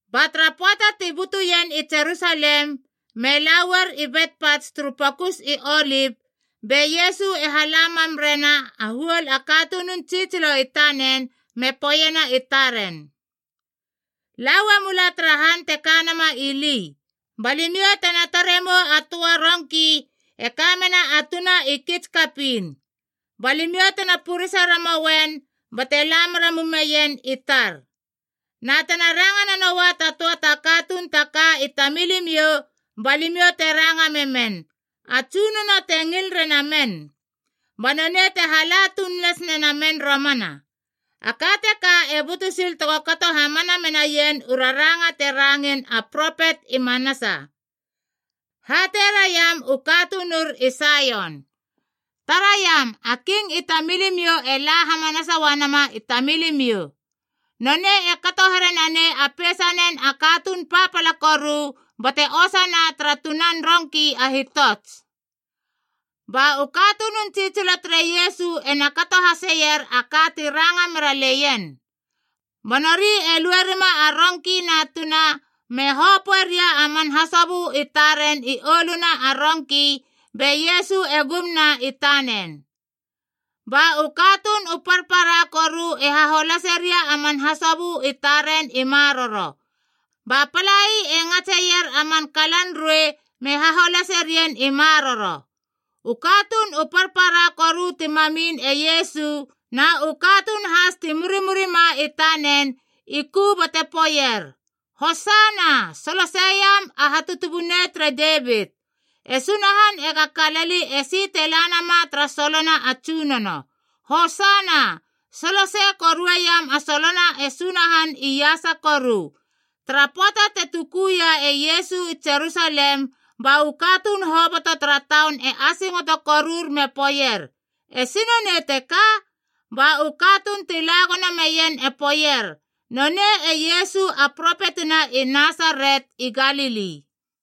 Ba tara pöata ti butuien i Jerusalem, me la uar i Betpats turu Pokus i Olip. Be Iesu e hala mam rena a huol a katunun tsitsilo i tanen me poeiena i taren, “La uamula tara han te kanama ili, ba limiou tena tare mou a töa rongki e kamena a tuna i kits kapiin. Ba limiou tena purese ramoien bate la mera mumeien i tar. Na tena ranga nanoa ta töa ta katuun ta ka i tamilimiou ba limiou te ranga memen, ‘A Tsunono te ngil rena men.’ Ba nonei te hala tuun las nena men romana.” A ka teka e butu sil tega kato hamana menaien u raranga te rangein a propet i manasa: “Hatei raiam u katunur i Saion, ‘Taraiam a King i tamilimiou e la hamanasa uanama i tamilimiou. Nonei e kato here nanei a peisanen a katuun papala koru bate osana tara tunan rongki a hitots.’” Ba u katunun tsitsilo tere Iesu ena kato haseier a ka ti ranga meraleien. Ba nori e lue rima a rongki na tuna, me hopöeria a man hasobö i taren i oluna a rongki, be Iesu e gumna i tanen. Ba u katuun u parpara koru e haholaseria a man hasobö i taren i maroro, ba palai e ngatseier a man kalan ruei me haholase rien i maroro. U katuun u parpara koru ti mamin e Iesu na u katuun has ti murimurima i tanen i ku bate poeier, “Hosana! Soloseiam a Hatutubunei tere Devit! E Sunahan ega kalali esi te la nama tara solona a Tsunono. Hosana! Solosei korueiam a solona e Sunahan iasa koru!” Tara pöata te tukuia e Iesu i Jerusalem, ba u katuun hoboto tara taun e asingoto korur me poeier, “Esi nonei teka?” Ba u katuun ti la gono meien e poeier, “Nonei e Iesu a propetina i Nasaret i Galili.”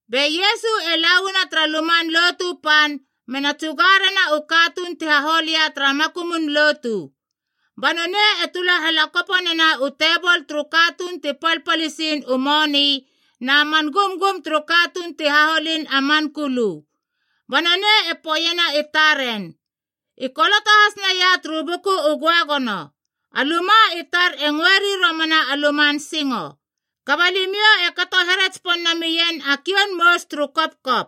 Be Iesu e lauana tara Luman Lotu Pan mena tsuga rena u katuun ti hahol ia tara makumun lotu. Ba nonei e tula halakoponena u tebol turu katuun ti palpalisiin u moni na man gumgum turu katuun ti haholin a man kulu. Ba nonei e poeiena i taren, “I koloto has naia turu Buku u Göagono, ‘A luma i tar e ngöeri romana a luman singo.’ Kaba limiou e kato here tsipon namien a kioun mous turu kopkop!”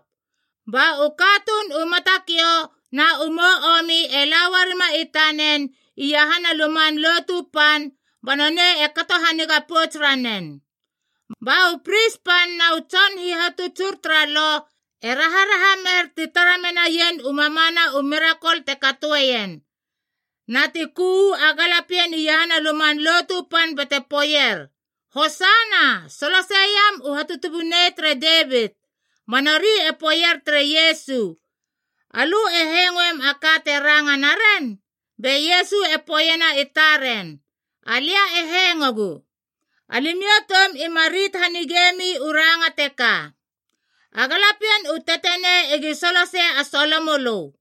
Ba u katuun u matakiou na u mou omi e la uarima i tanen iahana a Luman Lotu Pan ba nonei e kato haniga pouts ranen. Ba u pris pan na u tson hihatutsur tara Lo e raharaha mer ti tara menaien u mamana u mirakol te katoeien, na ti ku uu a galapien iahana a Luman Lotu Pan bate poeier, “Hosana! Soloseiam u Hatutubunei tere Devit!” Ba nori e poeier tere Iesu, “Alö e hengoeiem a ka te ranga naren?” Be Iesu e poeiena i taren, “Alia e hengogu. Alimiou toum ima rit hanigemi u ranga teka, ‘A galapien u tetenei egi solosei a solo mölö.’”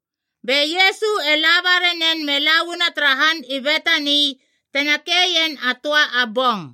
Be Iesu e laba ranen me la uana tara han i Betani, tena keien a töa a bong.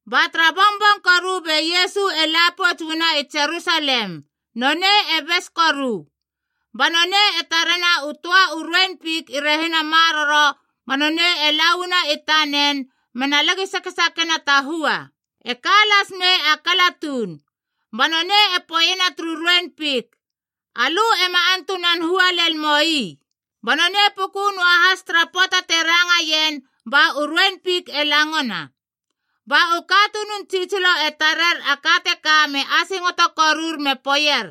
Ba tara bongbong koru be Iesu e la pouts uana i Jerusalem, nonei e bes koru. Ba nonei e tarena u töa u ruein fik i rehina maroro ba nonei e la uana i tanen, mena lagi sakesakena ta hua. E ka las mei a kala tuun. Ba nonei e poeiena turu ruein fik, “Alö ema antunan hua lel moi!” Ba nonei puku noahas tara pöata te rangaien ba u ruein fik e langona. Ba u katunun tsitsilo e tarer a ka teka me asingoto korur me poeier,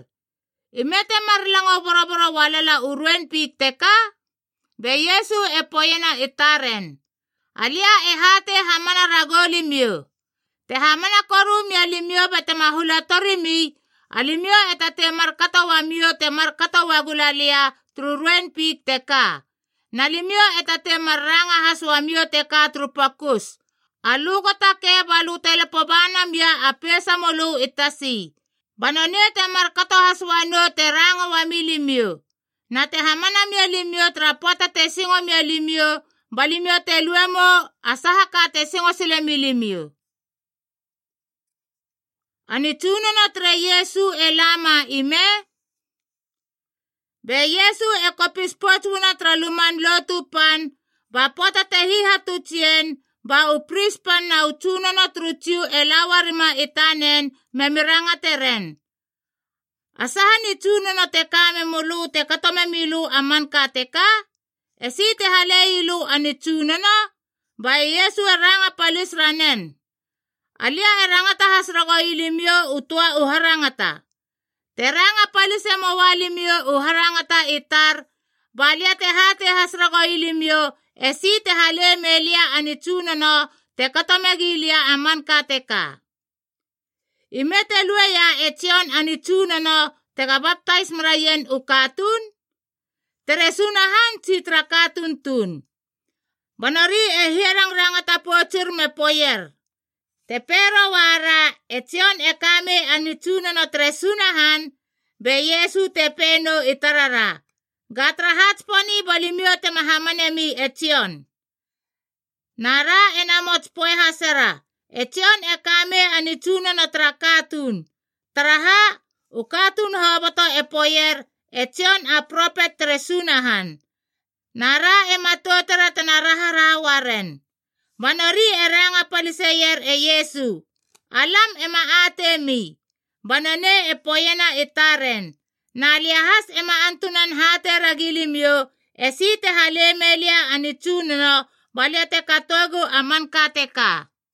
“Ime temar lango boroboro ualala u ruein fik teka?” Be Iesu e poeiena i taren, “Alia e hatei hamana ragou limiou, Te hamana koru mia limiou batema hula torimi, alimiou e tatei markato uamiou te markato uagu la lia turu ruein fik teka, na limiou e tatei mar ranga has uamiou teka turu pokus, ‘Alö go takei balö te lapo ba namia a peisamölö i tasi,’ ba nonei temar kato has uanou te ranga uami limiou. Na te hamana mia limiou, tara pöata te singo mia limiou ba limiou te lue mou a saha ka te singo silemi limiou.” A nitsunono tere Iesu e lama ime? Be Iesu e kopis pouts uana tara Luman Lotu Pan, ba pöata te hihatuts ien, ba u pris pan na u tsunono turu Jiu e la uarima i tanen memi rangateren, “A saha nitsunono te ka memölö te kato memi lö a manka teka? Esi te halei lö a nitsunono?” Ba e Iesu e ranga palis ranen, “Alia e rangata has ragoui limiou u töa u harangata. Te ranga palise moa limiou u harangata i tar, ba lia te hatei has ragoui limiou esi te hale melia a nitsunono te kato megi lia a manka teka. Ime te lueia e Jon a nitsunono tega baptais meraien u katuun? Tere Sunahan tsi tara katuun tuun?” Ba nori e hiarangrangata poutsur me poeier, “Te pei roara, ‘E Jon e kamei a nitsunono tere Sunahan,’ be Iesu te pei nou i tarara, ‘Ga taraha tsiponi ba limiou tema hamanemi e Jon?’ Na ra ena mots poe hasera, ‘E Jon e kamei a nitsunono tara katuun.’ Taraha, u katuun hoboto e poeier e Jon a propet tere Sunahan. Na ra e matoutera tena raharaha uaren.” Ba nori e ranga paliseier e Iesu, “Alam ema ateimi.” Ba nonei e poeiena i taren, “Na lia has ema antunan hatei ragi limiou esi te hale mei lia a nitsunono ba lia te katoegu a manka teka.”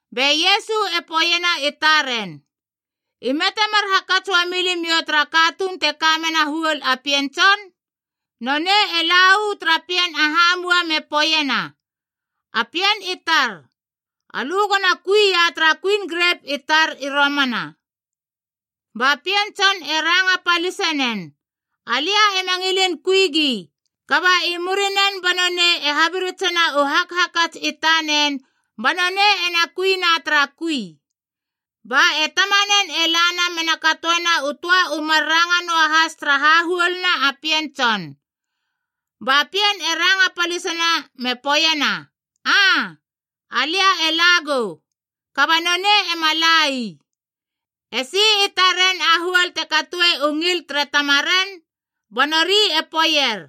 Be Iesu e poeiena i taren, “Ime temar hakats uami limiou tara katuun te kamena a huol a pien tson? Nonei e la uana tara pien a hamua me poeiena, ‘A pien i tar, alö gona kui ia tara kuin grep i romana.’ Ba pien tson e ranga palisinen, ‘Alia ema ngilin kui gi.’ Kaba i murinen ba nonei e habiritsena u hakhakats i tanen ba nonei ena kuina tara kui. Ba e tamanen e lana mena katoena u töa u mar ranga noahas tara hahuoluna pien tson. Ba pien e ranga palisina me poeiena, ‘Aa, alia e la gou.’ Kaba nonei ema la ii. “Esi i taren a huol te katoe u ngil tere tamaren?” Ba nori e poeier,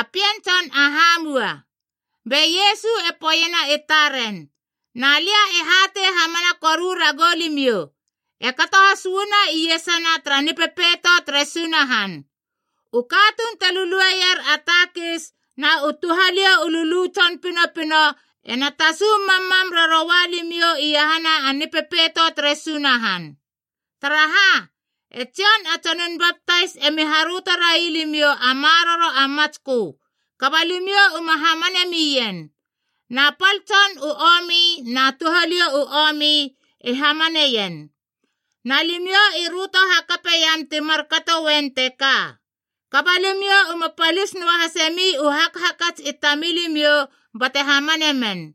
“A pien tson a hamua.” Be Iesu e poeiena i taren, “Na lia e hatei hamana koru ragou limiou, e kato has uana iesana tara Nipepeito tere Sunahan. U katuun te lulueier a takis na u touhaliou u lulu tson pinopino ena tasu mammam raroua limiou iahana Nipepeito tere Sunahan. Taraha, e Jon a Tsonun Baptais emi haröto rai limiou a maroro a matskö, kaba limiou uma hamane mien. Na pal tson u omi na touhaliou u omi i hamaneien. Na limiou i röto hakapeiam ti markato uen teka, kaba limiou uma palis noahasemi u hakhakats i tamilimiou bate hamane men.”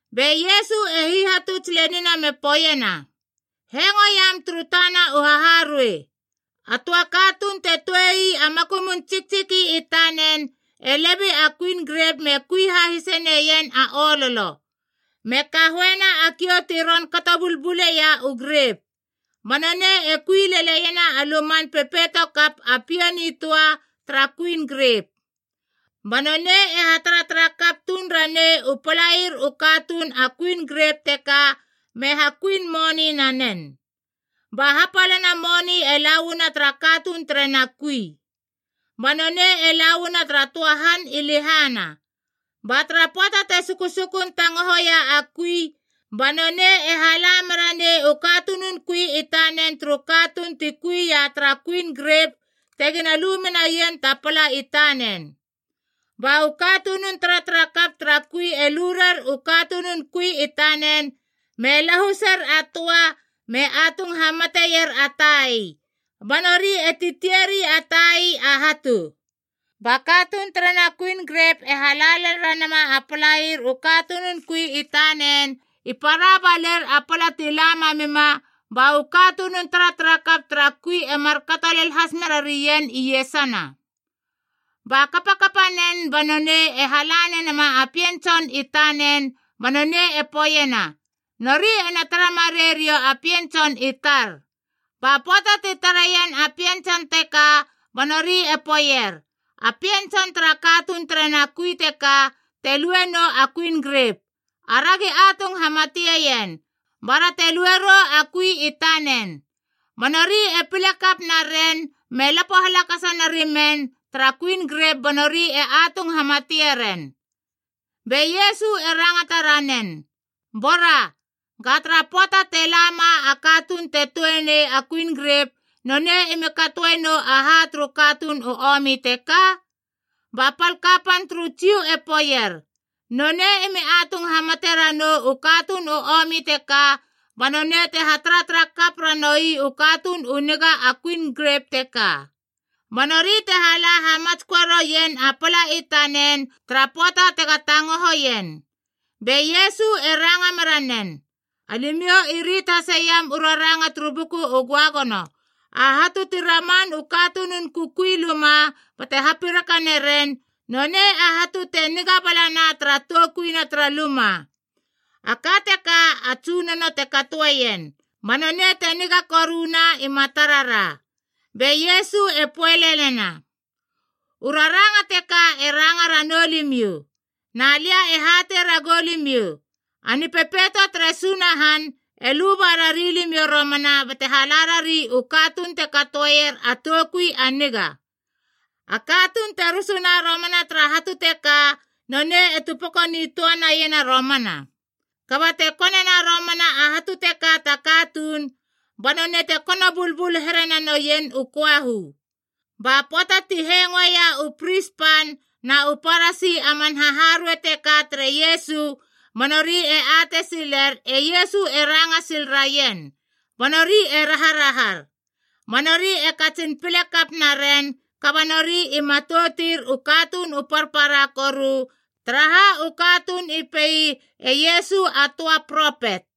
Be Iesu e hihatuts lenina me poeiena, “Hengoiam turu tana u haharuei. A töa katuun te tuei a makumun tsiktsiki i tanen e lebei a kuin grep me kui hahise neien a ololo, me kahoena a kiou ti ron kato bulbuleia u grep. Ba nonei e kui leleiena a luman pepeito kap a pia nitöa tara kuin grep. Ba nonei e hataratara kap tuun ranei u palair u katuun a kuin grep teka me hakuin moni nanen, ba hapalana moni e la uana tara katuun terena kui. Ba nonei e la uana tara töa han i lehana. “Ba tara pöata te susukun tangohoia a kui, ba nonei e hala mera nei u katunun kui i tanen turu katuun ti kui ia tara kuin grep tegina lu menaien ta pala i tanen. Ba u katunun taratarakap tara kui e lu rer u katunun kui i tanen, me lahuser a töa, me atung hamateier a tai, ba nori e titieri a tai a hatu. Ba katuun terena kuin grep e hala lel ranama a palair u katunun kui i tanen, i para baler a pala ti la mamima, ba u katunun taratarakap tara kui e markato lel has mera rien iesana. “Ba kapakapanen ba nonei e hala nena a pien tson i tanen, ba nonei e poeiena, ‘Nori ena tara marei riou a pien tson i tar.’ Ba pöata ti tareien a pien tson teka ba nori e poeier, ‘A pien tson tara katuun terena kui teka te lue nou a kuin grep. Aragi atung hamateien, bara te lue rou a kui i tanen!’ Ba nori e pile kap naren me lapo halakasa narimen tara kuin grep ba nori e atung hamatie ren.” Be Iesu e rangata ranen, “Bora, ga tara pöata te lama a katuun te tuenei a kuin grep, nonei emi katoe nou aha turu katuun u omi teka?” Ba pal kapan turu Jiu e poeier, “Nonei emi atung hamate ranou u katuun u omi teka, ba nonei te hataratara kap ranoui u katuun u niga a kuin grep teka, ba nori te hala hamatsköe roien a pala i tanen tara pöata tega tangohoien.” Be Iesu e ranga meranen, “Alimiou i rit haseiam u raranga turu Buku u Göagono, ‘A hatu ti raman u katunun kukui luma bate hapiraka naren, nonei a hatu te niga balana tara toukuina tara luma. A ka teka a Tsunono te katoeien, ba nonei te niga koruna i matarara!’” Be Iesu e poe lelena, “U raranga teka e ranga ranou limiou. Na lia e hatei ragou limiou, a Nipepeito tere Sunahan e luba rari limiou romana bate hala rari u katuun te katoeier a toukui a niga. A katuun te rusuna romana tara hatu teka nonei e tupeko nitöa naiena romana. Kaba te konena romana a hatu teka ta katuun, ba nonei te kono bulbul here nanoien u köahu.” Ba pöata ti hengoeia u pris pan na u Parasi a man haharuei teka tere Iesu, ba nori e atei siler e Iesu e ranga sil raien, ba nori e raharahar. Ba nori e katsin pile kap naren, kaba nori i matoutir u katuun u parpara koru, taraha u katuun i pei e Iesu a töa propet.